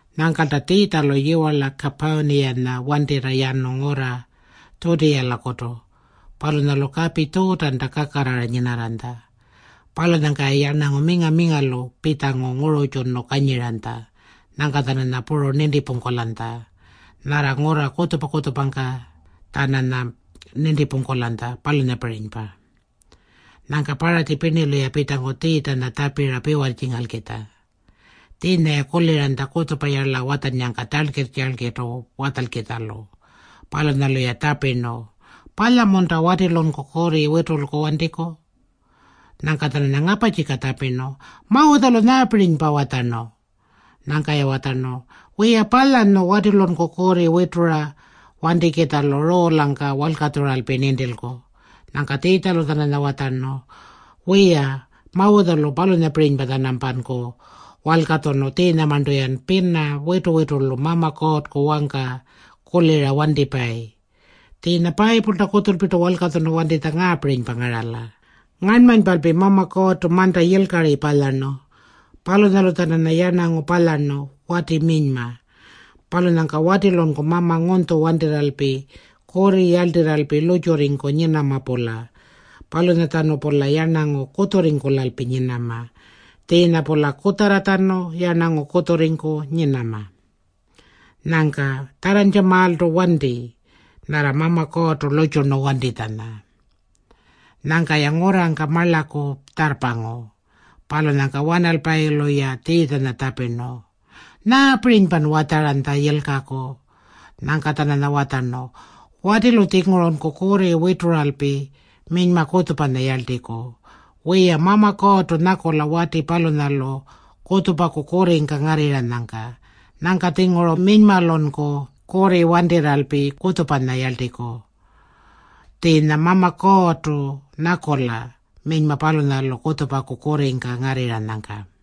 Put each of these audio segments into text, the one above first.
Nyangkalta Tjiitjalu yiwarla Kapurniyanya wantirra yanu ngurra Tjutiyalakutu. Palunyalu kapi Tjuutanta kakarrara nyinarranytja. Palunyangka-ya yarnangu minga-mingalu pitjangu ngururrtjunu kanyiranytja. Nyangka-tjananya puru nintipungkulanytja. Nyarra ngurra kutjupa-kutjupangka-tjananya nintipungkulanytja, palunyapirinypa. Nyangka Paratji pirnilu-ya pitjangu Tjiitjanya tjapira piwarrtjingalkitja. Tjiinya-ya kuliranytja kutjupayarla watjannyangka tjalkirr-tjalkirrtu watjalkitjalu. Palunyalu-ya tjapirnu, “Palya-munta watilunku kurri witulku wantiku?” Nyangka-tjananya ngaparrtjika tjapirnu, “Mawutjalu nyaapirinypa watjarnu?” Nyangka-ya watjarnu, “Wiya, palyanyu watilunku kurri witura wantikitjalu ruulangka walkatjuralpi nintilku.” Nyangka Tjiitjalu-tjananya watjarnu, “Wiya, Mawutjalu palunyapirinypa-tjanampanku walkatjunu tjiinyamarntu-yan pina witu-witulu Mama Kuurrku wangka kulira wantipayi. Tjiinya Payipulta kutjulpirtu walkatjunu wantitja ngaapirinypa ngarala, ‘Ngarnmanypalpi Mama Kuurrtu manta yilkari palyarnu. Palunyalu-tjananya yarnangu palyarnu, wati minyma. Palunyangka watilunku mama ngunytju wantirralpi kurri yarltirralpi lurrtjurringku nyinama-pula. Palunyatjanu-pula yarnangu kutjurringkulalpi nyinama. Tjiinya-pula kutjarratjanu yarnangu kutjurringku nyinama.’ Nyangka tjarrantjamaaltu wantima nyarra Mama Kuurrtu lurrtjurnu wantitjanya.” Nyangka-ya ngurrangka marlaku tjarrpangu. Palunyangka wanalpayilu-ya Tjiitjanya tjapirnu, “Nyaapirinypan watjaranytja yilkaku?” Nyangka-tjananya watjarnu, “Watilu-tjingurunku kurri wituralpi minyma kutjupanya yarltiku. Wiya, Mama Kuurrtu nyakula wati palunyalu kutjupaku kurringka ngarrirranyangka. Nyangka-tjinguru minymalunku kurri wantirralpi kutjupanya yarltiku. Tjiinya Mama Kuurrtu nyakula minyma palunyalu kutjupaku kurringka ngarrirranyangka.”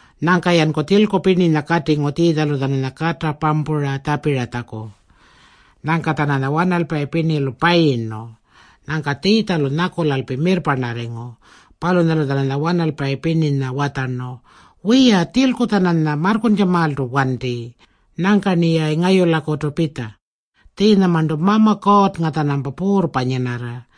Nyangka-yanku tjilku pirninya katingu Tjiitjalu-tjananya kata pampura tjapiratjaku. Nyangka-tjananya wanalpayi pirnilu payirnu. Nyangka Tjiitjalu nyakulalpi mirrparnarringu. Palunyalu-tjananya wanalpayi pirninya watjarnu, “Wiya, tjilku-tjananya marrkuntjamaaltu wanti. Nyangka-rniyayi ngayulakutu pitja. Tjiinyamarntu Mama Kuurrnga-tjanampa puurrpa nyinarra.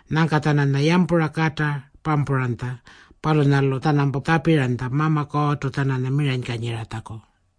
Nyangka-tjananya yampura kata pampuranytja. Palunyalu-tjanampa tjapiranytja Mama Kuurrtu-tjananya miranykanyiratjaku.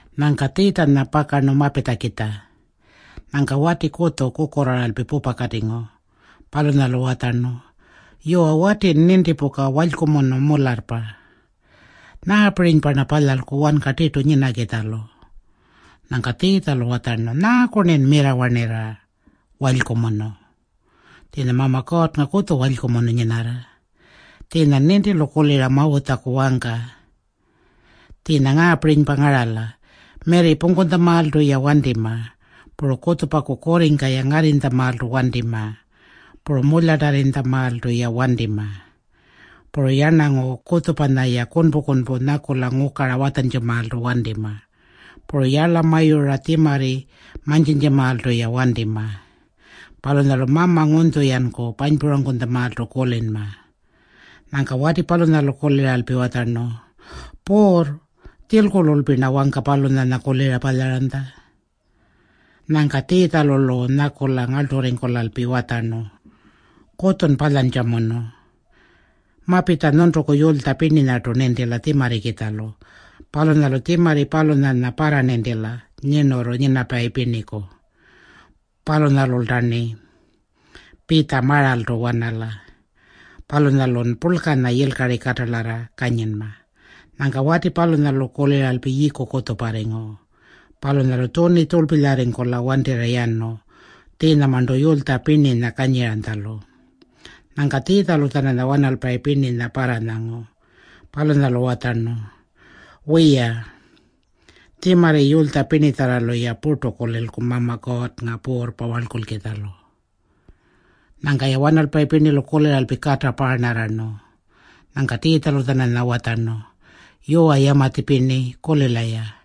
Nyangka Tjiitjanya pakarnu mapitjakitja. Nyangka wati kutju kukurraaralpi pupakatingu. Palunyalu watjarnu, “Yuwa, watin nintipuka, walykumunu mularrpa. Nyaapirinypa-rna palyalku wanka tirtu nyinakitjalu?” Nyangka Tjiitjalu watjarnu, “Nyaaku-rnin mirrawarnirra, ‘Walykumunu’? Tjiinya Mama Kuurrnga kutju walykumunu nyinarra. Tjiinyan nintilu kulira Mawutjaku wangka. Tjiinya ngaapirinypa ngarala. Mirri pungkutjamaaltu-ya wantima. Puru kutjupaku kurringka-ya ngarrinytjamaaltu wantima. Puru mulyatarrinytjamaaltu-ya wantima. Puru yarnangu kutjupanya-ya kunpu-kunpu nyakula ngukara watjantjamaaltu wantima. Puru yarlamayura tjimarri mantjintjamaaltu-ya wantima. Palunyalu mama ngunytju-yanku panypurangkutjamaaltu kulinma.” Nyangka wati palunyalu kuliralpi watjarnu, “Puurr, tjilkululpi-rna wangka palunyanya kulira palyaranytja.” Nyangka Tjiitjalu-lu nyakula ngarlturringkulalpi watjarnu, “Kutjun palyantjamunu. Mapitja nyuntuku yulytja pirninyartu nintila tjimarrikitjalu. Palunyalu tjimarri palunyanya parranintila nyirnurru nyinapayi pirniku. Palunyalulta-rni pitja maraltu wanala. Palunyalun yilkari katalarra purlkanya kanyinma.” Nyangka wati palunyalu kuliralpi yiiku kutjuparringu. Palunyalu tjuni tjurlpilyarringkula wantirra yanu tjiinyamarntu yulytja pirninya kanyiranytjalu. Nyangka Tjiitjalu-tjananya wanalpayi pirninya parranyangu. Palunyalu watjarnu, “Wiya, tjimarri yulytja pirnitjarralu-ya purtu kulilku Mama Kuurrnga puurrpa warlkulkitjalu.” Nyangka-ya wanalpayi pirnilu kuliralpi kata paarnarrarnu. Nyangka Tjiitjalu-tjananya watjarnu, “Yuwa, yamatji pirni, kulila-ya.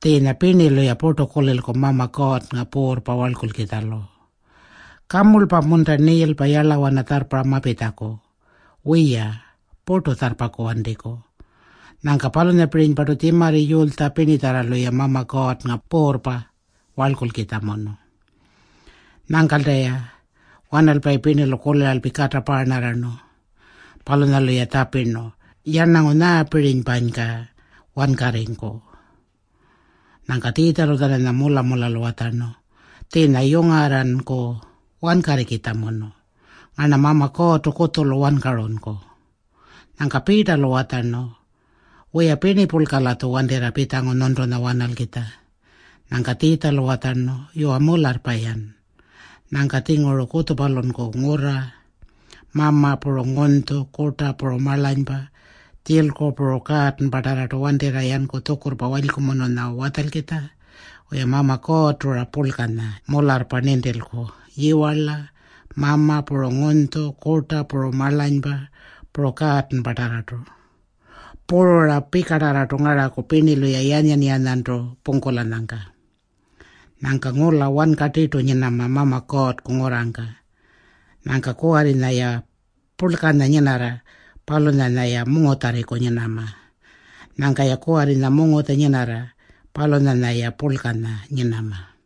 Tjiinya pirnilu-ya purtu kulilku Mama Kuurrnga puurrpa warlkulkitjalu. Kamurlpa-munta niilpa yarlawana tjarrparra mapitjaku? Wiya, purtu tjarrpaku wantiku. Nyangka palunyapirinypartu tjimarri yulytja pirnitjarralu-ya Mama Kuurrnga puurrpa warlkulkitjamunu.” Nyangkalta-ya wanalpayi pirnilu kuliralpi kata paarnarrarnu. Palunyalu-ya tjapirnu, “Yarnangu nyaapirinypanyka wankarringku?” Nyangka Tjiitjalu-tjananya mula-mulalu watjarnu, “Tjiinya yungarranku wankarrikitjamunu. Ngarna Mama Kuurrtu kutjulu wankarunku.” Nyangka Piitalu watjarnu, “Wiya, pirnipurlka-latju wantirra pitjangu nyuntunya wanalkitja.” Nyangka Tjiitjalu watjarnu, “Yuwa, mularrpa-yan. Nyangka-tjinguru kutjupalunku ngurra, mama puru ngunytju, kurta puru marlanypa, tjilku, puru kaatanpatarrartu wantirra yanku tjukurrpa walykumununya watjalkitja. Wiya, Mama Kuurrtu-ra purlkanya mularrpa nintilku, yiwarla, mama puru ngunytju, kurta puru marlanypa, puru kaatanpatarrartu. Puru-ra pikatarrartu ngaraku pirnilu-ya yanyan-yanyantu pungkulanyangka. Nyangka ngula wanka tirtu nyinama Mama Kuurrku ngurrangka. Nyangka kuwarrinya-ya purlkanya nyinarra, palunyanya-ya mungutjarriku nyinama. Nyangka-ya kuwarrinya mungutja nyinarra, palunyanya-ya purlkanya nyinama.”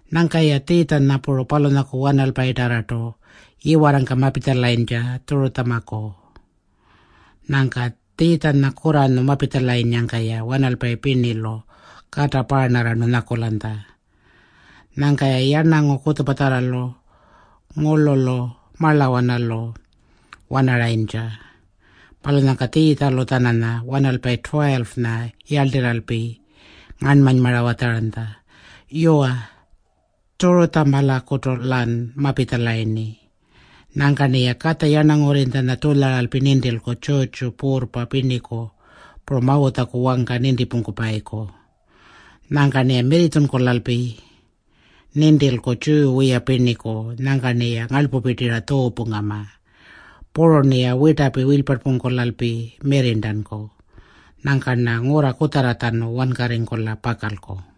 Nyangka-ya Tjiitjanya puru palunyaku wanalpayinyatarrartu yiwarrangka mapitjalayintja Tjurutjamaku. Nyangka Tjiitjanya kurranyu mapitjalanyangka-ya wanalpayi pirnilu kata paarnarrarnu nyakulanytja. Nyangka-ya yarnangu kutjupatjarralu ngurlulu marlawanalu wanaranytja. Palunyangka Tjiitjalu-tjananya wanalpayi 12-nya yarltirralpi ngarnmanymara watjaranytja, “Yuwa, Tjurutjamalakutu-lan mapitjalayirni. Nyangka-rniya Katja Yarnangurrinytjanya tjulyaralpi nintilku tjurrtjuku puurrpa pirniku puru Mawutjaku wangka nintipungkupayiku. Nyangka-rniya mirritjunkulalpi nintilku Tjiyu wiya pirniku. Nyangka-rniya ngarlpupirtira tjuupungama. Puru-rniya wirtapi wilyparnpungkulalpi mirrirntanku. Nyangka-rna ngurra kutjarratjanu wankarringkula pakalku.”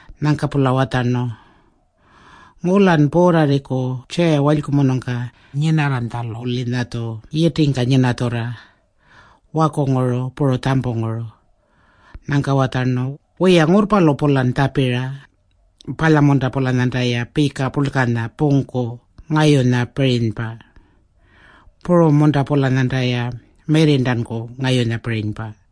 Nyangka-pula watjarnu, “Ngulan puurrarringku tjiya walykumunungka nyinarranytjalu-linyatju yitingka nyinatjurra, wakunguru puru tjampunguru.” Nyangka watjarnu, “Wiya, ngurrpalu-pulan tjapira. Palya-munta-pulanyantaya pika purlkanya pungku ngayunyapirinypa? Puru-munta-pulanyantaya mirrirntanku ngayunyapirinypa?”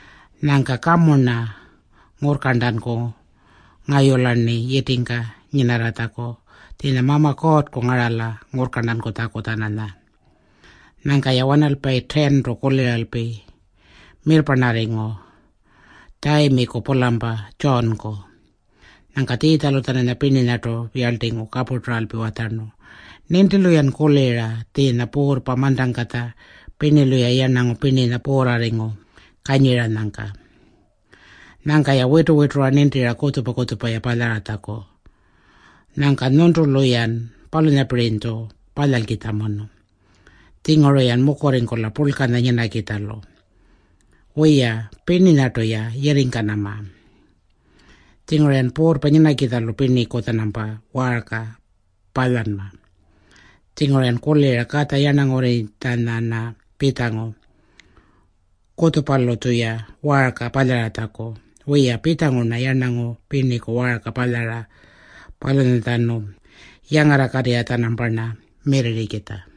Nyangka kamu-rna ngurrkarntanku ngayula-rni yitingka nyinarratjaku. Tjiinya Mama Kuurrku ngarala ngurrkarntankutjaku-tjananya.” Nyangka-ya wanalpayi 10-tu kuliralpi mirrparnarringu Tjayimiku-pulampa Tjuunku. Nyangka Tjiitjalu-tjananya pirninyartu yarltingu kapurturalpi watjarnu, “Nintilu-yan kulira tjiinya puurrpa mantangkatja pirnilu-ya yarnangu pirninya puurrarringu kanyiranyangka. Nyangka-ya witu-witura nintira kutjupa-kutjupa-ya palyaratjaku. Nyangka nyuntulu-yan palunyapirinytju palyalkitjamunu. Tjinguru-yan mukurringkula purlkanya nyinakitjalu. Wiya, pirninyartu-ya yirringkanama. Tjingurun puurrpa nyinakitjalu pirniku-tjanampa waarka palyanma. Tjinguru-yan kulira Katja Yarnangurrinytjanya-rna pitjangu kutjupalu-tjuya waarka palyaratjaku. Wiya, pitjangu-rna yarnangu pirniku waarka palyara palunyatjanu yangarrakatirra-tjanamparna mirrirrikitja.”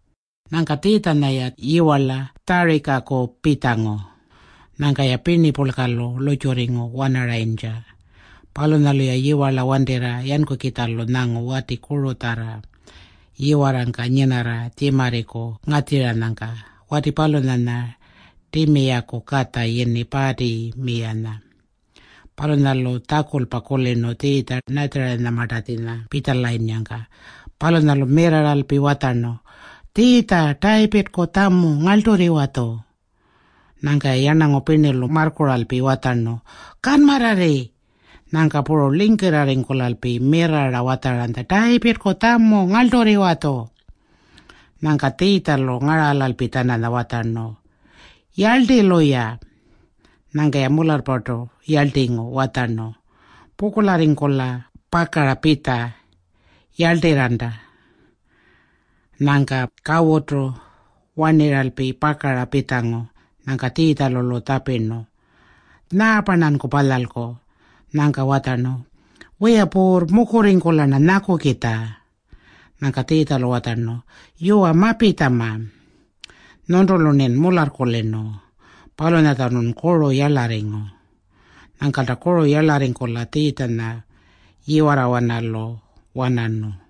Nyangka Tjiitjanya-ya yiwarla Tjarikaku pitjangu. Nyangka-ya pirnipurlkalu lurrtjurringu wanarayintja. Palunyalu-ya yiwarla wantirra yankukitjalu nyangu wati kurutjarra yiwarrangka nyinarra tjimarriku ngatjiranyangka. Wati palunyanya Timiyaku katja yini Paatimiyanya. Palunyalu tjakulpa kulirnu Tjiitja-Natjarinyamartatjinya pitjalayinnyangka. Palunyalu mirrarralpi watjarnu, “Tjiitja, Tayipirrku tjamu, ngarlturriwa-tju.” Nyangka-ya yarnangu pirnilu marrkuralpi watjarnu, “Kanmarrarri.” Nyangka puru lingkirrarringkulalpi mirrarra watjaranytja, “Tayipirrku tjamu, ngarlturriwa-tju.” Nyangka Tjiitjalu ngaralalpi-tjananya watjarnu, “Yarlti-luya.” Nyangka-ya mularrpartu yarltingu watjarnu, “Pukurlarringkula pakara pitja. Yarltirranta.” Nyangka kawutu warnirralpi pakara pitjangu. Nyangka Tjiitjalu-lu tjapirnu, “Nyaapa-rnanku palyalku?” Nyangka watjarnu, “Wiya Puurr, mukurringkula-rna nyakukitja.” Nyangka Tjiitjalu watjarnu, “Yuwa, mapitjama. Nyuntulu-rnin mularrkulirnu. Palunyatjanun kuru yarlarringu.” Nyangkalta kuru yarlarringkula Tjiitjanya yiwarrawanalu wanarnu.